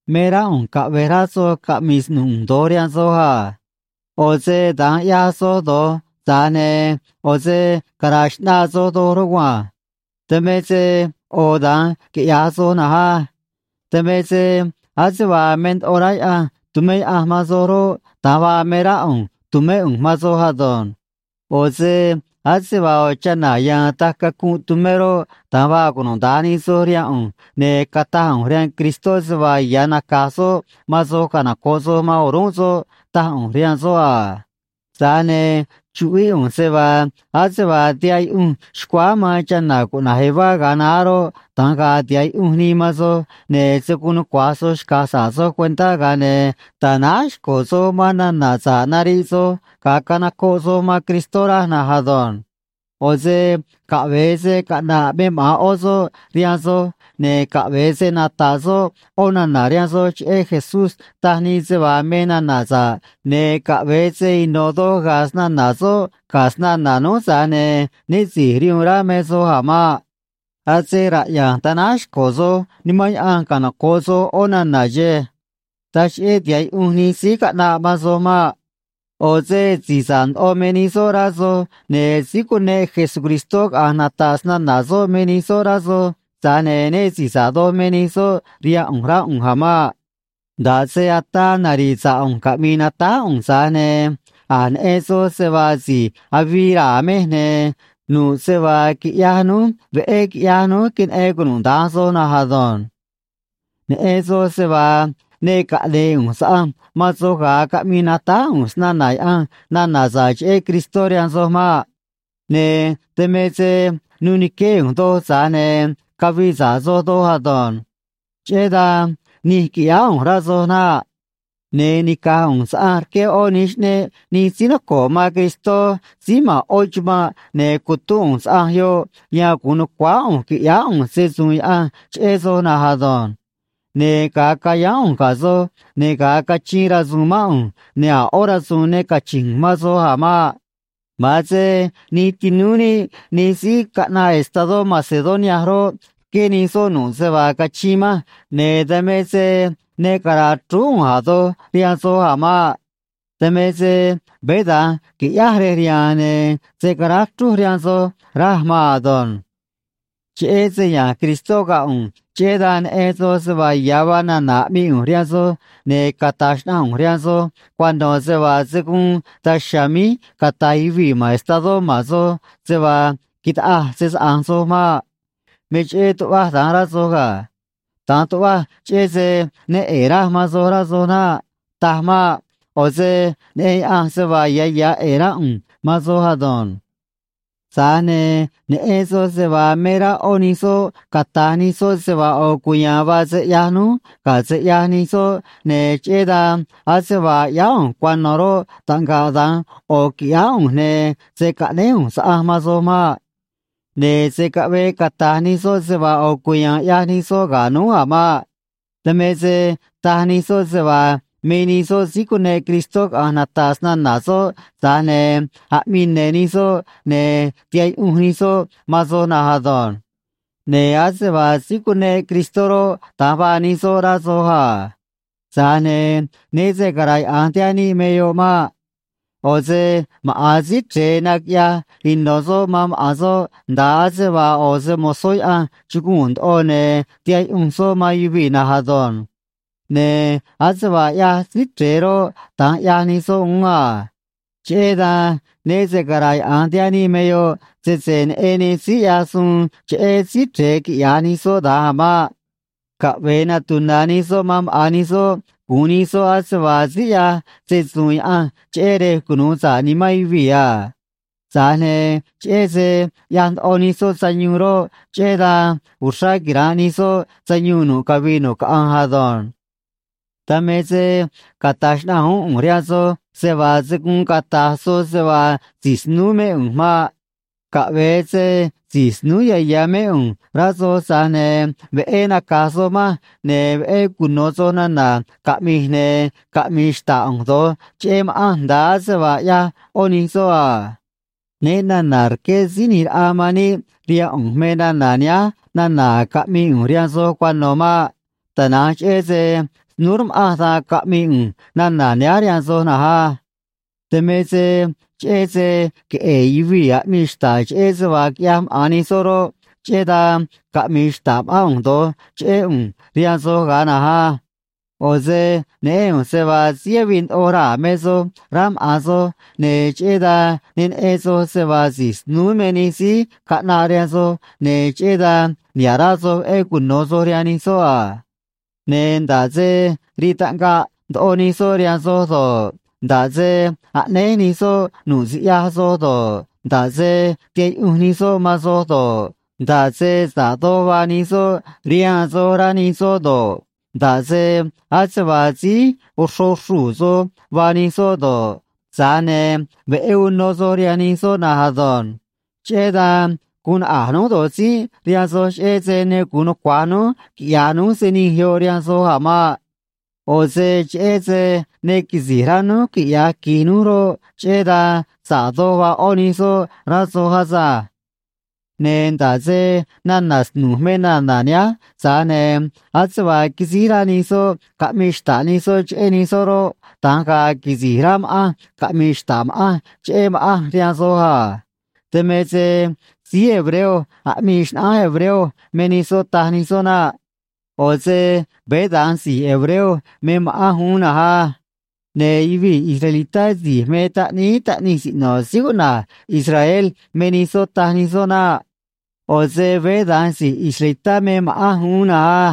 Me rá ꞌu̱nj caꞌve̱j rá soj caꞌmi̱i̱ snu̱j ꞌu̱nj do̱j rihaan soj a. ꞌO̱ se da̱nj ꞌyaj soj do̱j, tza̱j ne̱ ꞌo̱ se cara̱a̱ xꞌnaa soj doj rugua̱nj. Dan me se ꞌo̱ da̱nj quiꞌya̱j soj na̱nj á. Dan me se ase vaa me ndoꞌo rá Yaꞌanj tu̱mé Yaꞌanj man soj roꞌ, da̱nj vaa me rá ꞌu̱nj tu̱mé ꞌu̱nj man soj ado̱nj. ꞌO̱ se ase vaa ꞌo̱ chana̱ ya̱a̱n taj cacunꞌ tumé roꞌ, da̱nj vaa cunuda̱nj nij soj rihaan ꞌu̱nj, ne̱ cataj ꞌu̱nj rihaan Cristó se vaa ya̱ naca̱j soꞌ man soj canoco̱ꞌ soj man o̱rúnꞌ soꞌ, taj ꞌu̱nj rihaan soꞌ a. Tza̱j ne̱ chuꞌvíꞌ ꞌu̱nj se vaa ase vaa tihaꞌ yuꞌunj xcuáá man chana̱ cuꞌna̱j Eva ga̱a naá roꞌ, da̱nj ga̱a̱ tiha̱ꞌ yuꞌunj nii man soj, ne̱ se̱ guun nucua̱j soj xca̱j sa̱ꞌ soj cuentá, ga̱a ne̱ ta̱náj xco̱ soj man nana̱ sa̱ꞌ nariꞌ soj ga̱a canocoꞌ soj man Cristó, raj na̱nj ado̱nj. ꞌO̱ se caꞌve̱e se caꞌna̱ꞌ me maꞌa̱n ꞌó soꞌ rihaan soj, ne̱ caꞌve̱e se nata̱ꞌ soꞌ ꞌó nana̱ rihaan soj cheꞌé Jesús taj nii se vaa me nana̱ sa̱ꞌ, ne̱ caꞌve̱e se ino̱ doj ga̱a̱ snana̱ soꞌ ga̱ snana̱ núj, tza̱j ne̱ né si̱j rihuun rá me soj a̱ maꞌ. Ase raꞌya̱nj tanáj xco̱ soj Nimán Yaꞌanj canoco̱ꞌ soj ꞌó nana̱ xe̱e̱. Taj cheꞌé tiha̱ꞌ yuꞌunj nij síí caꞌnaꞌ man soj maꞌ. ꞌO̱ se si̱j sa̱ꞌ ndoꞌo me nij soꞌ, rá soj, ne̱ síí cuneꞌ Jesucristó caꞌa̱nj nata̱ꞌ snana̱ soꞌ me nij soꞌ, rá soj, tza̱j ne̱ né si̱j sa̱ꞌ doj me nij soꞌ rihaan ꞌu̱nj, rá ꞌu̱nj a̱ maꞌ. Nda̱ꞌ se ataa nari̱ꞌ sa̱ꞌ ꞌu̱nj caꞌmi̱i̱ natáj ꞌu̱nj, tza̱j ne̱ a̱j neꞌen soj se vaa si̱j avii raa̱ mej, ne̱ nu̱ꞌ se vaa quiꞌyaj núj veꞌé quiꞌyaj núj, queneꞌen cunuda̱nj soj na̱nj ado̱nj. Neꞌen soj se vaa ne caꞌne̱e̱ ꞌu̱nj saꞌanj man soj ga̱a caꞌmii natáj ꞌu̱nj snana̱ Yaꞌanj nana̱ sa̱ꞌ cheꞌé Cristó rihaan soj maꞌ. Ne̱ dan me se nuu ni̱qué ꞌu̱nj doj, tza̱j ne̱ cavii sa̱ꞌ soj doj ado̱nj. Cheꞌé dan nij quiꞌyáá ꞌu̱nj, rá soj naꞌ. Ne̱ nica̱j ꞌu̱nj saꞌanj rqué ꞌó nij xꞌneꞌ nij síí noco̱ꞌ man Cristó síí ma̱n ꞌó chumanꞌ, ne̱ cutúnꞌ ꞌu̱nj saꞌanj yoꞌ yan gu̱un nu̱cuáá ꞌu̱nj qui̱ꞌyáá ꞌu̱nj se‑su̱u̱n Yaꞌanj cheꞌé soj na̱nj ado̱nj. Ne̱ ga̱a cayáán ꞌu̱nj ga̱ soj, ne̱ ga̱a cachiin rasu̱u̱n mán ꞌu̱nj, ne̱ a̱ ꞌó rasu̱u̱n ne cachi̱nj ꞌu̱nj man soj a̱ maꞌ. Ma̱an se nij tinúú níꞌ nij síí caꞌnaꞌ estadó Macedonia roꞌ, rqué nij soꞌ nu̱ꞌ se vaa cachiin manj, ne̱ dan me se ne cara̱a̱ chrúú ꞌu̱nj a̱ doj rihaan soj a̱ maꞌ. Dan me se veé da̱nj qui̱ꞌyáj rej riha̱a̱n, ne̱ se̱ caráj chrúj rihaan soj, raj maan ado̱nj. Cheꞌé se ya̱nj Cristó ga̱ ꞌu̱nj, cheꞌé dan neꞌen soj se vaa ya̱ vaa nana̱ aꞌmii ꞌu̱nj rihaan soj, ne̱ cata̱j xnaꞌanj ꞌu̱nj rihaan soj cuano̱ se vaa se̱ guun daj chiha̱a̱ míj cata̱j yuvii̱ ma̱n estadó ma̱n soj se vaa quitaꞌaj se‑saꞌa̱nj soj maꞌ. Me cheꞌé tuꞌvaj da̱nj, rá soj ga̱. Da̱nj tuꞌvaj cheꞌé se ne ꞌe̱e̱ raj man soj, rá soj naꞌ. Taj maꞌ. ꞌO̱ se neꞌen Yaꞌanj se vaa ya̱ ya̱ ꞌe̱e̱ rá ꞌu̱nj man soj ado̱nj. Tza̱j ne̱ neꞌen soj se vaa me rá ꞌó nij soꞌ cata̱j nij soꞌ se vaa ꞌo̱ cuya̱a̱n vaa se ꞌyaj núj ga̱ se ꞌyaj nij soꞌ, ne̱ cheꞌé dan ase vaa ꞌyáá ꞌu̱nj cuano̱ roꞌ, taꞌngaꞌ da̱nj ꞌo̱ qui̱ꞌyáá ꞌu̱nj, ne̱ se̱ caꞌnéj ꞌu̱nj saꞌanj man soj maꞌ. Ne̱ se̱ caꞌvee cata̱j nij soꞌ se vaa ꞌo̱ cuya̱a̱n ꞌyaj nij soꞌ ga̱ núj a̱ maꞌ. Dan me se taj nij soꞌ se vaa me nij soꞌ síí cuneꞌ Cristó caꞌa̱nj nata̱ꞌ snana̱ soꞌ, tza̱j ne̱ aꞌmii ne̱ nij soꞌ, ne̱ tihaꞌ yuꞌunj nij soꞌ man soj na̱nj ado̱nj. Ne̱ ase vaa síí cuneꞌ Cristó roꞌ, da̱nj vaa nij soꞌ rá soj a. Tza̱j ne̱ né se cara̱yaꞌa̱nj tihaꞌ níꞌ me yoꞌ maꞌ. ꞌO̱ se maꞌa̱n Síí Chre̱e naquiꞌyaj ino̱ soꞌ man maꞌa̱n soꞌ, nda̱a ase vaa ꞌo̱ se‑mo̱zó Yaꞌanj chuguu̱n ndoꞌo, ne̱ tihaꞌ yuꞌunj soꞌ man yuvii̱ na̱nj ado̱nj. Ne̱ ase vaa ꞌyaj Síí Chre̱e roꞌ, da̱nj ꞌyaj nij soꞌ uún a. Cheꞌé dan, né se cara̱yaꞌa̱nj tihaꞌ níꞌ me yoꞌ, sese neꞌen nij síí ꞌyaj suun cheꞌé Síí Chre̱e quiꞌya̱j nij soꞌ da̱nj a̱ maꞌ. Caꞌve̱e natuna̱ nij soꞌ man maꞌa̱n nij soꞌ gu̱un nij soꞌ ase vaa síí ꞌyaj se‑su̱u̱n Yaꞌanj cheꞌé rej cunu̱u sa̱ꞌ nimán yuvii̱ a. Tza̱j ne̱ cheꞌé se ꞌyaj ndoꞌo nij soꞌ sayuun roꞌ, cheꞌé dan uxrá quira̱nꞌ nij soꞌ sayuun nu̱ꞌ cavii nu̱ꞌ caꞌanj ado̱nj. Dan me se cata̱j xnaꞌanj uún ꞌu̱nj rihaan soj se vaa se̱ guun cata̱j soj se vaa si̱j snúú mé ꞌu̱nj maꞌ. Caꞌve̱e se si̱j snúú ya̱ ya̱ mé ꞌu̱nj rá soj, tza̱j ne̱ veꞌé naca̱j soj manj, ne̱ veꞌé cuno̱ soj nana̱ caꞌmi̱j, ne̱ caꞌmi̱i̱ xta̱ꞌ ꞌu̱nj do̱j cheꞌé ma̱ꞌanj nda̱a ase vaa ꞌyaj ꞌó nij soꞌ a. Né na̱na̱ rqué Síí ꞌNi̱j Raꞌa man níꞌ rihaan ꞌu̱nj me nana̱ nihánj nana̱ caꞌmi̱i̱ ꞌu̱nj rihaan soj cuano̱ maꞌ. Tana̱nj cheꞌé se snúú rma̱ꞌanj, dan caꞌmi̱i̱ ꞌu̱nj nana̱ nihánj rihaan soj na̱nj á. Dan me se cheꞌé se queꞌe̱e̱ yuvii̱ aꞌmii xta̱ꞌ cheꞌé se vaa quiꞌyaj maꞌa̱n nij soꞌ roꞌ, cheꞌé dan caꞌmi̱i̱ xta̱ꞌ ma̱ꞌán ꞌu̱nj do̱j cheꞌé ꞌu̱nj rihaan soj ga̱a na̱nj á. ꞌO̱ se neꞌén ꞌu̱nj se vaa síí avii ndoꞌo raa̱ me soj, rá maꞌa̱n soj, ne̱ cheꞌé dan ne neꞌen soj se vaa si̱j snúú me nij síí caꞌnaꞌ rihaan soj, ne̱ cheꞌé dan niha̱ꞌ rá soj veꞌé cuno̱ soj rihaan nij soꞌ a. Ne̱ nda̱ꞌ se rii taꞌngaꞌ ndoꞌo nij soꞌ rihaan soj do̱ꞌ, nda̱ꞌ se aꞌnéj nij soꞌ nu̱ꞌ siꞌyaj soj do̱ꞌ, nda̱ꞌ se tihaꞌ yuꞌunj nij soꞌ man soj do̱ꞌ, nda̱ꞌ se sa̱ꞌ doj vaa nij soꞌ rihaan soj rá nij soꞌ do̱ꞌ, nda̱ꞌ se ase vaa síí oxro xruu̱ soj vaa nij soꞌ do̱ꞌ, tza̱j ne̱ veꞌé uno soj rihaan nij soꞌ na̱nj ado̱nj. Cheꞌé dan guun naꞌa̱j núj do̱j tzínꞌ rihaan soj, cheꞌé se ne gu̱un nucua̱j núj quiꞌya̱j núj se nij yoꞌ rihaan soj a̱ maꞌ. ꞌO̱ se cheꞌé se ne quisi̱j rá núj quiꞌya̱j qui̱j núj roꞌ, cheꞌé dan sa̱ꞌ doj vaa ꞌó nij soꞌ, rá soj asânj. Ne̱ nda̱ꞌ se nana̱ snu̱j me nana̱ nihánj, tza̱j ne̱ ase vaa quisíj rá nij soꞌ caꞌmi̱i̱ xta̱ꞌ nij soꞌ cheꞌé nij soꞌ roꞌ, da̱nj ga̱a̱ quisi̱j rá ma̱ꞌanj caꞌmi̱i̱ xta̱ꞌ ma̱ꞌanj cheꞌé ma̱ꞌanj rihaan soj a. Dan me se síí hebreo aꞌmii xnaꞌánj hebreo me nij soꞌ, taj nij soꞌ naꞌ. ꞌO̱ se veé da̱nj si̱j hebreo me ma̱ꞌanj uún na̱nj á. Ne̱ yuvii̱ israelitá si̱j me taꞌníí taꞌnij siꞌno̱ síí cuꞌna̱j Israel me nij soꞌ, taj nij soꞌ naꞌ. ꞌO̱ se veé da̱nj si̱j israelitá me ma̱ꞌanj uún na̱nj á.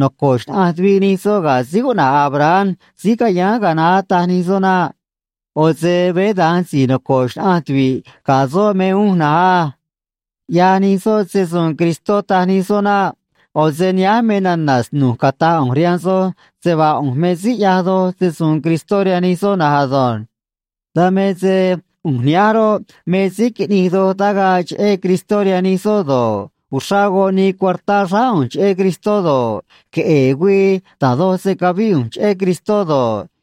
Noco̱ꞌ xnaꞌanj tuviꞌ nij soꞌ ga̱ síí cuꞌna̱j Abraham síí cayáán ga̱a naá, taj nij soꞌ naꞌ. ꞌO̱ se veé da̱nj si̱j noco̱ꞌ xnaꞌanj tuvi̱ꞌ ga̱ soꞌ mej uún na̱nj á. ꞌYaj nij soꞌ se‑su̱u̱n Cristó, taj nij soꞌ naꞌ. ꞌO̱ se nihánj me nana̱ snu̱j cata̱j ꞌu̱nj rihaan soj se vaa ꞌu̱nj me síí ꞌyaj doj se‑su̱u̱n Cristó rihaan nij soꞌ na̱nj ado̱nj. Dan me se ꞌu̱nj nihánj roꞌ, me síí quiꞌnij doj tagaꞌ cheꞌé Cristó rihaan nij soꞌ do̱ꞌ, uxrá goꞌ nii cuartá xráá ꞌu̱nj cheꞌé Cristó do̱ꞌ, queꞌe̱e̱ güii da̱j doj se cavíꞌ ꞌu̱nj cheꞌé Cristó do̱ꞌ,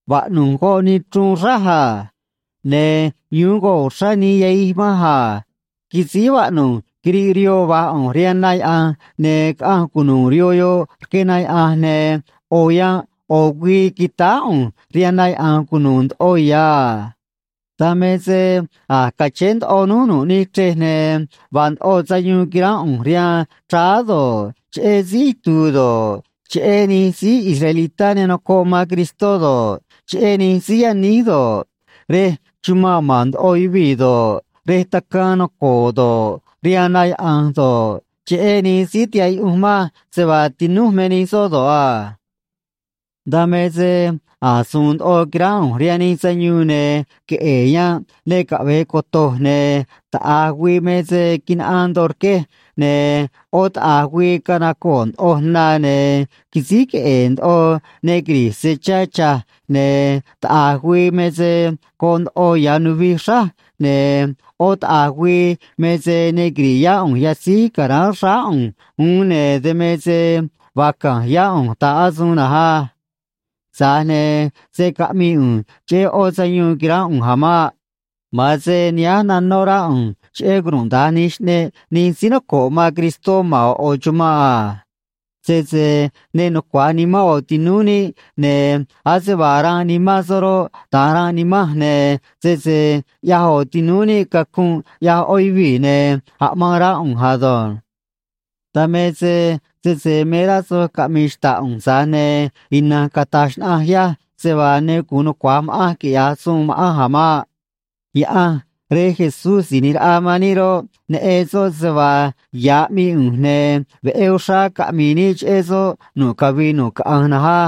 Vaꞌnu̱j goꞌ nii chruun xráj a. Ne̱ yu̱u̱n goꞌ uxrá nii yahij manj a. Quisíj vaꞌnu̱j quiriꞌ rihoo va̱j ꞌu̱nj rihaan na yaꞌa̱nj, ne̱ caꞌanj cunu̱u̱ rihoo yoꞌ rque na yaꞌa̱nj, ne̱ ꞌo̱ yanꞌ ꞌo̱ güii quitáá ꞌu̱nj rihaan na yaꞌa̱nj cunu̱u̱ ndoꞌo ya̱ a. Dan me se a̱j cachéé ndoꞌoj nu̱ꞌ nij chrej, ne̱ vaa ndoꞌo sayuun quiránꞌ ꞌu̱nj rihaan chráá do̱ꞌ, cheꞌé síí itu̱u̱ do̱ꞌ, cheꞌé nij síí israelitá ne nocoꞌ man Cristó do̱ꞌ, cheꞌé nij síí yaníj do̱ꞌ, rej chumanꞌ ma̱n ndoꞌo yuvii̱ do̱ꞌ, rej tacaan naco̱o̱ do̱ꞌ, rihaan na yaꞌa̱nj do̱ꞌ, cheꞌé nij síí tihaꞌ yuꞌunj manj se vaa tinúj me nij soꞌ do̱ꞌ a. Dan me se a̱j su̱u̱n ndoꞌo quiránꞌ ꞌu̱nj rihaan nij sayuun, ne̱ queꞌe̱e̱ yanꞌ ne caꞌve̱e coto̱j, ne̱ taꞌa̱j güii me se quinaꞌaan ndoꞌo rquej, ne̱ ꞌó taꞌa̱j güii canacoo̱ ndoꞌoj na, ne̱ quisíj queꞌe̱e̱ ndoꞌo ne quiri̱j se chá cha̱j, ne̱ taꞌa̱j güii me se goꞌ ndoꞌo ya̱ nuvij xráj, ne̱ ꞌó taꞌa̱j güii me se ne quiri̱ꞌ yá ꞌu̱nj yatzíj ca̱ráán xráá ꞌu̱nj uún, ne̱ dan me se vaa ca̱nj yá ꞌu̱nj ta̱ꞌ asuun na̱nj á. Tza̱j ne̱ se̱ caꞌmii ꞌu̱nj cheꞌé ꞌó sayuun quiránꞌ ꞌu̱nj a̱ maꞌ. Ma̱an se nihánj nanó rá ꞌu̱nj cheꞌé cunuda̱nj nij xꞌneꞌ nij síí noco̱ꞌ man Cristó ma̱n ꞌo̱ ꞌo̱ chumanꞌ a. Sese ne nucua̱j nimán ꞌo̱ tinúú níꞌ, ne̱ ase vaa ranꞌ nimán soꞌ roꞌ, da̱nj ranꞌ nimanj, ne̱ sese ꞌyaj ꞌo̱ tinúú níꞌ cacunꞌ, ꞌyaj ꞌó yuvii̱, ne̱ aꞌmaan rá ꞌu̱nj ado̱nj. Dan me se, sese me rá soj caꞌmi̱i̱ xta̱ꞌ ꞌu̱nj, tza̱j ne̱ ina̱nj cata̱j xnaꞌanj yaj se vaa ne gu̱un nucua̱j ma̱ꞌanj quiꞌya̱j suun ma̱ꞌanj a̱ maꞌ. Yaꞌanj Rej Jesús Si̱j ꞌNi̱j Raꞌa man níꞌ roꞌ, neꞌen soꞌ se vaa ya̱ aꞌmii ꞌu̱nj, ne̱ veꞌé uxrá caꞌmi̱i̱ níꞌ cheꞌé soꞌ nu̱ꞌ cavii nu̱ꞌ caꞌanj na̱nj á.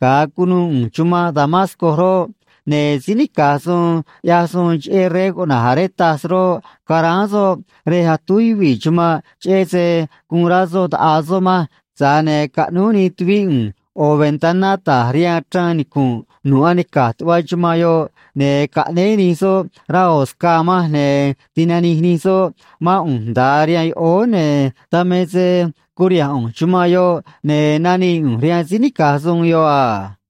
Ga̱a cunuu ꞌu̱nj chumanꞌ Damasco roꞌ, ne̱ síí nica̱j suun ꞌyaj suun cheꞌé rey cuꞌna̱j Aretas roꞌ, caráán soꞌ rej atúj yuvii̱ chumanꞌ, cheꞌé se guun rá soꞌ ta̱ꞌaa soꞌ manj, tza̱j ne̱ caꞌnúj nij tuvíꞌ ꞌu̱nj ꞌo̱ ventaná ta̱j rihaan chraan nicu̱nꞌ nu̱ꞌ anica̱j tuꞌva chumanꞌ yoꞌ, ne̱ caꞌnéé nij soꞌ rá ꞌo̱ scaa manj, ne̱ tinanij nij soꞌ mán ꞌu̱nj nda̱a rihaan yoꞌóó, ne̱ dan me se curiha̱nj ꞌu̱nj chumanꞌ yoꞌ, ne̱ nanii ꞌu̱nj rihaan síí nica̱j suun yoꞌ a.